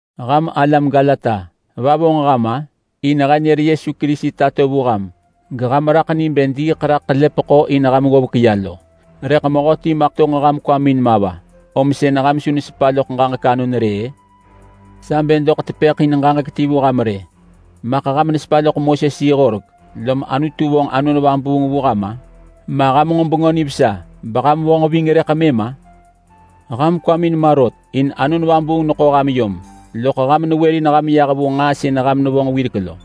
Ham alam Galata! Va vonġ ham-a? In he nër Yesu Kerisi tato vu ham geham raḳ ni bë diiḳ raḳ ḳelepeḳo in ham ggovek ya. Rëḳ mehöti maḳ tonġ ham kwamin ma va om sën ham su nesepa loḳ ġaġek anon rë-ë? Sa bë doḳ tepëḳ in ġaġek ti vu ham rë. Maḳ ham nesepa loḳ Moses-yi-horek lom Anutu vonġ Anon Vabuung vu ham-a? Ma ham nġo Bengö Nivesa beham vonġ ving rëḳ mëm-a? Ham kwamin ma rot, in Anon Vabuung neḳo ham yom, loḳ ham newërin ham yah vu nġaa sën ham nevonġ wirek lo!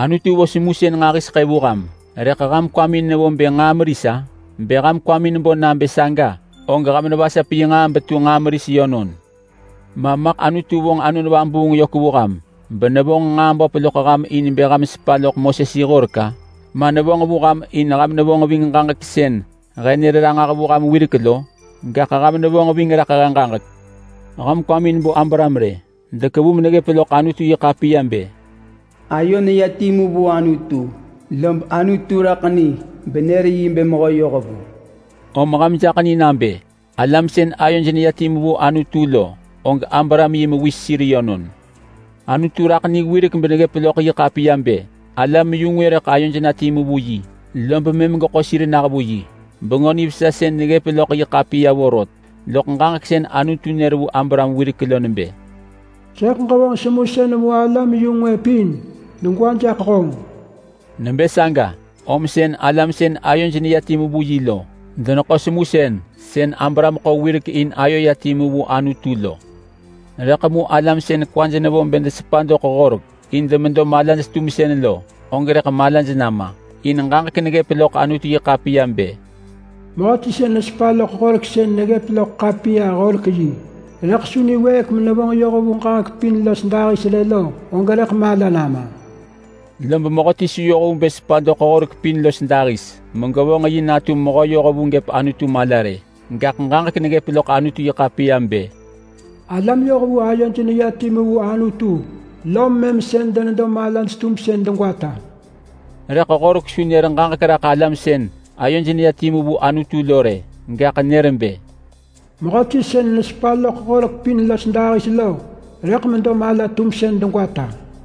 Anutu vo semusën nġahiseḳë vu ham rëḳ ham kwamin nevo bë nġaa meris-a? Bë ham kwamin bo nabë saga og ham nevasap yi nġaa betu nġaa meris yönon! Ma maḳ Anutu vonġ Anon Vabuung yök vu ham benevonġ nġaa böp loḳ ham in ham nesepa loḳ Moses-yi-horek-a? Ma nevonġ vu ham in ham nevonġ ving ġaġek sën he nër ranġah vu ham wirek lo? Gaḳ ham nevonġ ving raḳ he ġaġek. Ham kwamin bo Abraham rë! Dekevu meneggëp loḳ Anutu-yi-ḳapiya bë, “Ayo neya timu vu Anutu lob Anutu raḳ ni benër yi bë mehö yohvu.” Om ham jaḳ ni nabë alam sën ayoj neya timu vu Anutu lo og Abraham yi mewis sir yönon. Anutu raḳ ni wirek beneggëp loḳ yi ḳapiya bë, alam-yu-ngwë rëḳ ayoj na timu vu yi lob mëm geḳo sir nah vu yi. Bengö Nivesa sënë neggëp loḳ yi ḳapiya vorot, loḳ ġaġek sën Anutu nër vu Abraham wirek lo nebë, “Sëḳ ġevonġ semusën vu alam-yu-ngwë pin degwa jaḳ honġ!” Nebë saga om sën alam sën ayoj neya timu vu yi lo deneḳo semusën sën Abraham ḳo wirek in ayo ya timu vu Anutu lo. Rëḳ mu alam sën kwaj nevo bë desepa doḳ Horek in demedo malaj-tumsën lo, og rëḳ malaj nama, in ġaġek neggëp loḳ Anutu-yi-ḳapiya bë, “Mehöti sën nesepa loḳ Horek sën neggëp loḳ ḳapiya-horek-yi rëḳ su niwëëk menevonġ yoh vu ġaġek pin los dahis rë lo, og rëḳ mala nama.” Lob mehöti su yoh vu bë sepa doḳ Horek pin los dahis megevonġ yi natu mehö yohvu gëp Anutu mala rë. Gaḳ ġaġek neggëp loḳ Anutu-yi-ḳapiya bë, “Alam yohvu ayoj neya timu vu Anutu lom mëm sën denedo malaj-tumsën degwata.” Rëḳ Horek su nër ġaġek raḳ alam sën ayoj neya timu vu Anutu lo rë, gaḳ nër bë, “Mehöti sën nesepa loḳ Horek pin los dahis lo rëḳ medo mala-tumsën degwata.”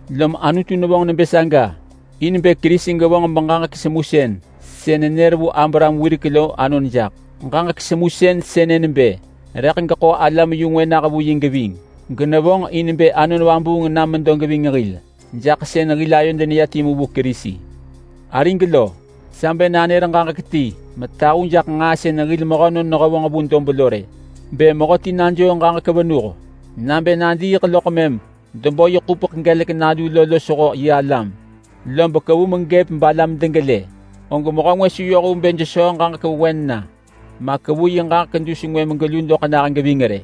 Lom Anutu nevonġ nebë saga in bë Kerisi gevonġ beġaġek semusën sën nenër vu Abraham wirek lo anon jaḳ. Ġaġek semusën sënë nebë rëḳ geḳo alam-yu-ngwë nah vu yi geving. Genevonġ in bë Anon Vabuung nam medo geving hil jaḳ sën hil ayod neya timu vu Kerisi. Arig lo, sa bë nanër ġaġek ti metahu jaḳ nġaa sën hil mehönon nehevonġ vu dob lo rë. Bë mehöti najoo ġaġek venuh nabë nadiiḳ loḳ mëm debo yi ḳupeḳ gelek nalu lo losho yi alam, lob kevu megëp balam degelë, og mehö ngwë su yoh vu bë jesöö ġaġek vewen na, ma kevu yi ġaġek dus ngwë megelu doḳ na geving rë.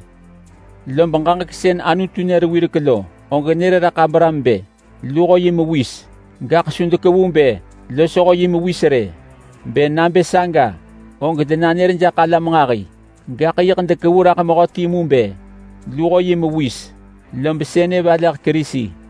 Lob ġaġek sën Anutu nër wirek lo, og nër raḳ Abraham bë, “luho yi mewis”. Su dekevu bë “losho yi mewis” rë. Bë nabë saga og denanër jaḳ alam nġahi, gaḳ yiḳ dekevu raḳ mehö timu bë, “luho yi mewis”, lob sënë valeḳ Kerisi.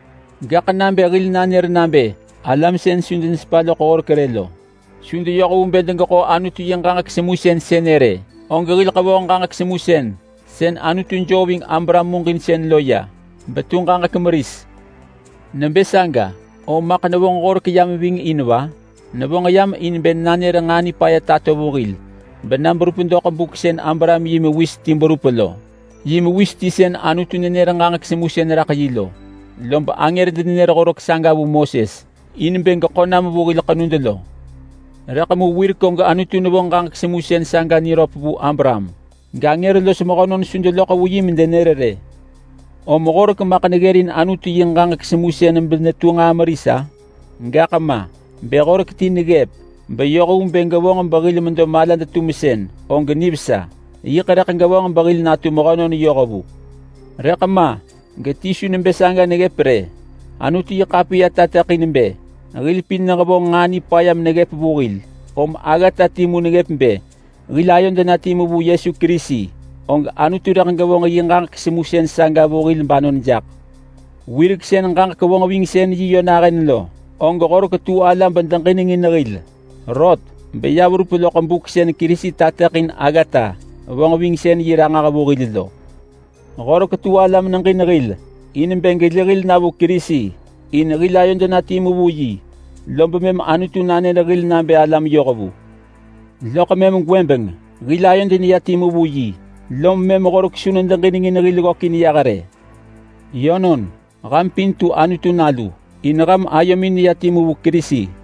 Gaḳ nabë hil nanër nabë alam sën su denesepa loḳ Horek rë lo su deyoh vu bë degeḳo Anutu yi ġaġek semusën sënë rë, og hil ḳevoh ġaġek semusën sën Anutu joo ving Abraham muġinsën lo ya betu ġaġek meris. Nebë saga, om maḳ nevonġ Horek yam ving in va? Nevonġ yam in bë nanër nġaa nipaya tato vu hil bena berup doḳ buk sën Abraham yi mewis ti berup lo. Yi mewis ti sën Anutu nenër ġaġek semusën raḳ yi lo. Lob angër denenër Horek saga vu Moses in bë geḳo nam vu hil ḳenud lo. Rëḳ mu wirek og Anutu nevonġ ġaġek semusën saga niröp vu Abraham, gangër los mehönon su deloḳ vu yi medenër rë. Om Horek maḳ neggërin Anutu yi ġaġek semusën benetu nġaa meris-a? Gaḳ ma! Bë Horek ti neggëp beyoh vu bë gevonġ behil medo malad-tumsën og nivesa. Yiḳ rëḳ gevonġ behil natu mehönon yohvu. Rëḳ ma, geti su nebë saga rë. Anutu-yi-ḳapiya tateḳin bë hil pin nehevonġ nġaa nipaya meneggëp vu hil, om aggata timu neggëp. Bë hil ayod na timu vu Yesu Kerisi, og Anutu rëḳ gevonġ yi ġaġek semusën saga vu hil banon jaḳ. Wirek sën ġaġek vonġvingsën-yi yö nahën lo, og Horek tu ala bedeġinengin hil. Rot beya verup loḳ buk sën Kerisi tateḳin aggata vonġvingsën-yi ranġah vu hil lo. Horek tu ala meneġin hil in bë geli hil na vu Kerisi, in hil ayod na timu vu yi lob mëm Anutu nanër hil nabë hil alam yohvu. Loḳ mëm gwëbeng hil ayod neya timu vu yi, lom mëm Horek su nedeġinengin hil ggökin yah rë. Yönon, ham pin tu Anutu nalu in ham ayomin neya timu vu Kerisi.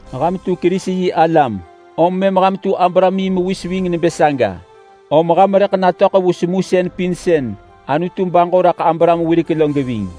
Ham tu Kerisi-yi-alam om mëm ham tu Abraham yi mewis ving nebë saga, om ham rëḳ natöḳ vu semusën pin sën Anutu baġo raḳ Abraham wirek lo geving.